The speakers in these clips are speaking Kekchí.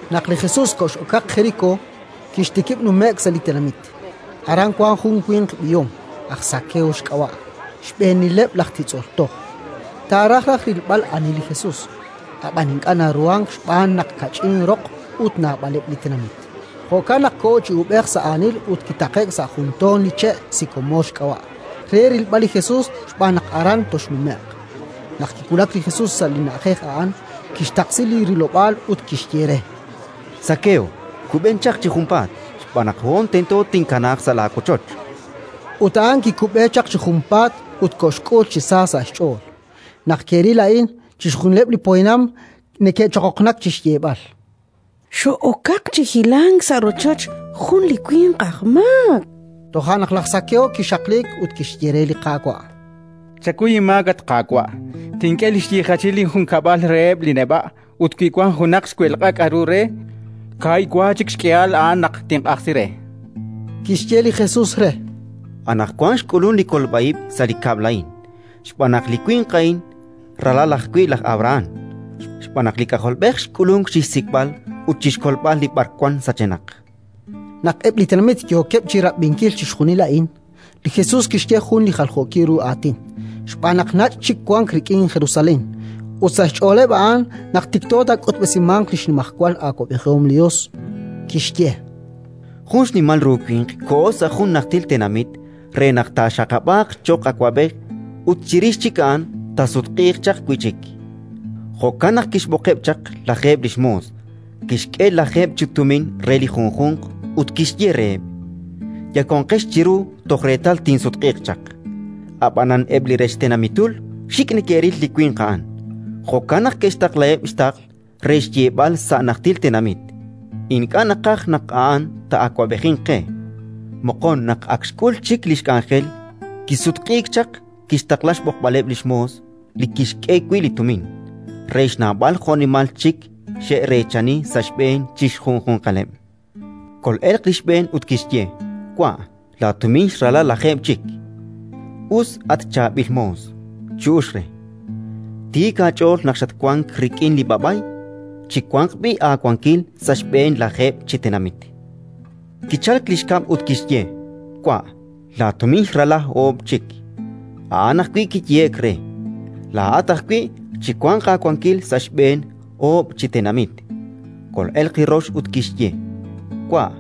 Naq li Jesus kox'okaq Jerikó, kixtikib' nume'k sa' li tenamit. Aran wank jun li winq b'ihom, aj Zakeo xk'ab'a', xb'eenileb' laj titz'ol toj. Taaraj raj rilb'al ani li Jesus, ab'an ink'a' naruhank xb'aan naq kach'in roq ut naab'aleb' li tenamit. Jo'kan naq koho chi uub'ej sa' aanil ut kitaqe'k sa' jun toon li che', sikomoor xk'ab'a', re rilb'al li Jesus xb'aan naq aran toxnume'q. Naq kiwulak li Jesus sa' li na'ajej a'an, kixtaqsi li rilob'aal ut kixye re: —Zakeo, kub'en chaq chi junpaat, xb'aan naq hoon tento tinkanaaq sa' laawochoch. Ut a'an kikub'e chaq chi junpaat ut koxk'ul chi sa sa' xch'ool. Naq ke'ril a'in, chixjunileb' li poyanam neke'choqoqnak chi xyeeb'al: “Xo'okaq chi hilank sa' rochoch jun li winq aj maak”. Toja' naq laj Zakeo kixaqliik ut kixye re li Qaawa': —Chakuy inmaak, at Qaawa'. Tink'e li xyiijachil linjunkab'lal reheb' li neb'a', ut wi wank junaq xwelq'a k'aru re, kaahib' wa chik xk'ihal a'an naq tinq'ajsi re. Kixye li Jesus re: —Anaqwan xk'ulunk li kolb'a ib' sa' li kab'l a'in, xb'aan naq li winq a'in ralal ajwi' laj Abrahán. Xb'aan naq li K'ajolb'ej xk'ulunk chi xsik'b'al ut chi xkolb'al li b'arwan sachenaq. Naq eb' li tenamit yookeb' chi rab'inkil chixjunil a'in, li Jesus kixye jun li jaljookil ru aatin, xb'aan naq nach' chik wank rik'in Jerusalén, ut sa' xch'ooleb' a'an naq tikto taak'utb'esimanq li xnimajwal awab'ejihom li Yos. Kixye: “Jun xnimal ru winq koho sa' jun najtil tenamit re naq taaxaqab'aaq cho'q awab'ej ut chirix chik a'an taasutq'iiq chaq wi' chik. Jo'kan naq kixb'oqeb' chaq lajeeb' li xmoos, kixk'e lajeeb' chi tumin re li junjunq ut kixye reheb': «Yakonqex chiru toj reetal tinsutq'iiq chaq». Ab'anan eb' li rech tenamitul xik' neke'ril li winq a'an; jo'kan naq ke'xtaqlaheb' xtaql re xyeeb'al sa' li najtil tenamit: «Ink'a' naqaj naq a'an taa'awab'ejinq qe». “Moqon, naq ak xk'ul chik li xk'anjel, kisutq'iik chaq, kixtaqla xb'oqb'aleb' li xmoos li kixk'e wi' li tumin, re xnawb'al jo'nimal chik xe'reechani sa' xb'een chi xjunjunqaleb'. Kol'elq li xb'een ut kixye: «Wa', laatumin xrala lajeeb' chik». «Us, at chaab'il moos -chu'uxk re-. Tiik aach'ool naq xatwank rik'in li b'a'b'ay; chiwanq b'i' aawankil sa' xb'een lajeeb' chi tenamit». Kichalk li xkab' ut kixye: «Wa', laatumin xrala oob' chik». A'an ajwi' kiyehe'k re: «Laa'at ajwi' chiwanq aawankil sa' xb'een oob' chi tenamit». “Kol'elq li rox ut kixye: «Wa',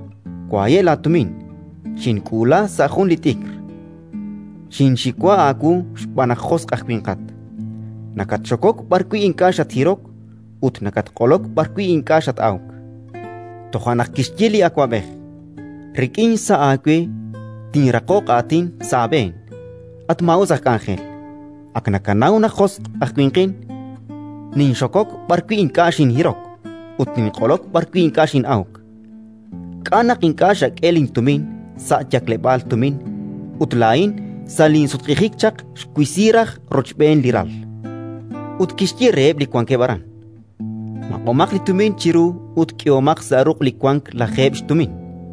waye' laatumin. Xink'uula sa' jun li t'ikr: xinxiwa aawu xb'aan naq josq' aj winqat; nakatxokok b'arwi' ink'a' xathirok ut nakatq'olok b'arwi' ink'a' xat-awk». “Toja' naq kixye li awab'ej: «Rik'in xsa' aawe tinraqoq aatin sa' aab'een, at maa'us aj k'anjel. Ak nakanaw naq josq' aj winqin: ninxokok b'arwi' ink'a' xinhirok ut ninq'olok b'arwi' ink'a' xin'awk. K'a' naq ink'a' xak'e lintumin sa' yakleb'aal tumin ut laa'in, sa' linsutq'ijik chaq, xwisi raj rochb'een li ral?». Ut kixye reheb' li wankeb' aran: «Maq'omaq li tumin chiru ut k'ehomaq sa' ruq' li wank lajeeb' xtumin».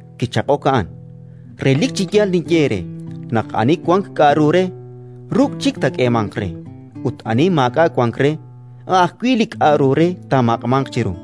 “Kichaq'ok a'an: «Relik chi yaal ninye eere naq ani wank k'aru re, ruk' chik taak'eemanq re; ut ani maak'a' wank re, a' ajwi' li k'aru re taamaq'manq chiru.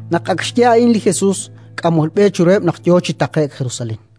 Naq ak xye a'in li Jesus, k'amol b'e chiruheb' naq yo chi taqe'k Jerusalén.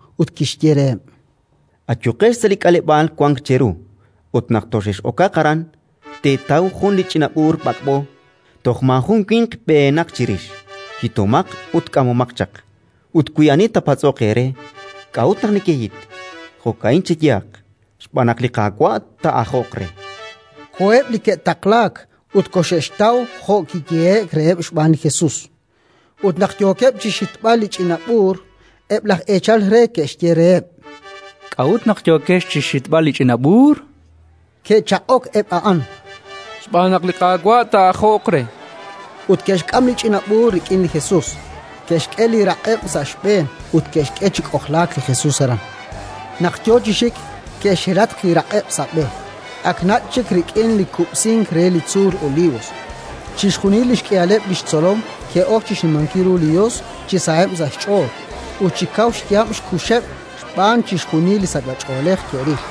ut kixye reheb': —Ayuqex sa' li k'aleb'aal wank cheru ut, naq toxex'okaq aran, teetaw jun li ch'ina b'uur b'ak'b'o, toj maajun winq b'ehenaq chirix. Hitomaq ut k'amomaq chaq. Ut wi ani taapatz'oq eere: «K'a'ut naq nekehit?», jo'ka'in cheyehaq: «Xb'aan naq li Qaawa' taa'ajoq re». Koheb' li ke'taqlaak ut koxe'xtaw jo' kiyehe'k reheb' xb'aan li Jesus. Ut naq yookeb' chi xhitb'al li ch'ina b'uur, eb' laj eechal re ke'xye reheb': —K'a'ut naq yookex chi xhitb'al li ch'ina b'uur? Ke'chaq'ok eb' a'an: —Xb'aan naq li Qaawa' taa'ajoq re, chankeb'. Ut ke'xk'am li ch'ina b'uur rik'in li Jesus, ke'xk'e li raq'eb' sa' xb'een ut ke'xk'e chi k'ojlaak li Jesus aran. Naq yo chi xik, ke'xhelatq li raq'eb' sa' b'e. Ak nach' chik rik'in li kub'sink re li tzuul Olivos, chixjunil li xk'ihaleb' li xtzolom ke'ok chi xnimankil ru li Yos chi saheb' sa' xch'ool ut chi kaw xyaab' xkuxeb' xb'aan chixjunil li sachb'ach'oolej ke'ril.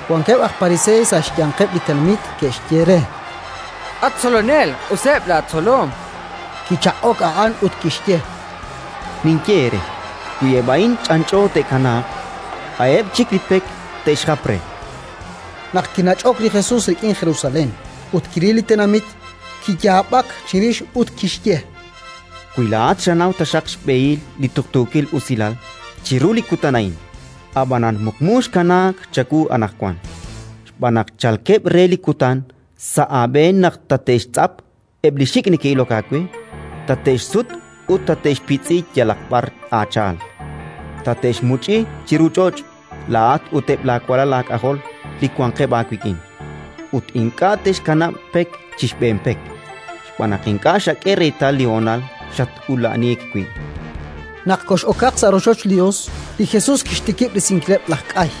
Wankeb' aj Pariseey sa' xyanqeb' li tenamit ke'xye re: —At Tzolonel, q'useb' laatzolom. Kichaq'ok a'an ut kixye: —Ninye eere: wi eb' a'in ch'anch'o te'kanaaq, a'eb' chik li pek te'xjap re. Naq kinach'ok li Jesus rik'in Jerusalén ut kiril li tenamit, kiyaab'ak chirix ut kixye: “Wi laa'at xanaw taxaq xb'ehil li tuqtuukil usilal chiru li kutan a'in! Ab'anan muqmu xkanaak chawu anaqwan. Xb'aan naq chalkeb' re li kutan sa' aab'een naq tate'xtz'ap eb' li xik' neke'ilok aawe, tate'xsut ut tate'xpitz'i yalaq b'ar aacha'al; tate'xmuch'i chiru ch'och' laa'at ut eb' laawalal aak'ajol li wanqeb' aawik'in, ut ink'a' te'xkanab' pek chi xb'een pek, xb'aan naq ink'a' xak'e reetal li honal xat-ula'aniik wi'”. Naq kox'okaq sa' rochoch li Yos, li Jesus kixtikib' risinkileb' laj k'ay,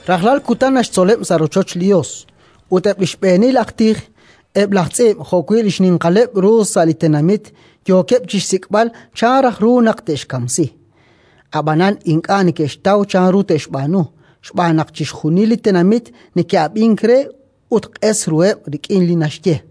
Rajlal kutan naxtzoleb' sa' rochoch li Yos, ut eb' li xb'eenil aj tij, eb' laj tz'iib' jo'wi' li xninqaleb' ru sa' li tenamit yookeb' chi xsik'b'al chan raj ru naq te'xkamsi. Ab'anan ink'a' neke'xtaw chanru te'xb'aanu, xb'aan naq chixjunil li tenamit neke'ab'ink re ut q'es ruheb' rik'in li naxye.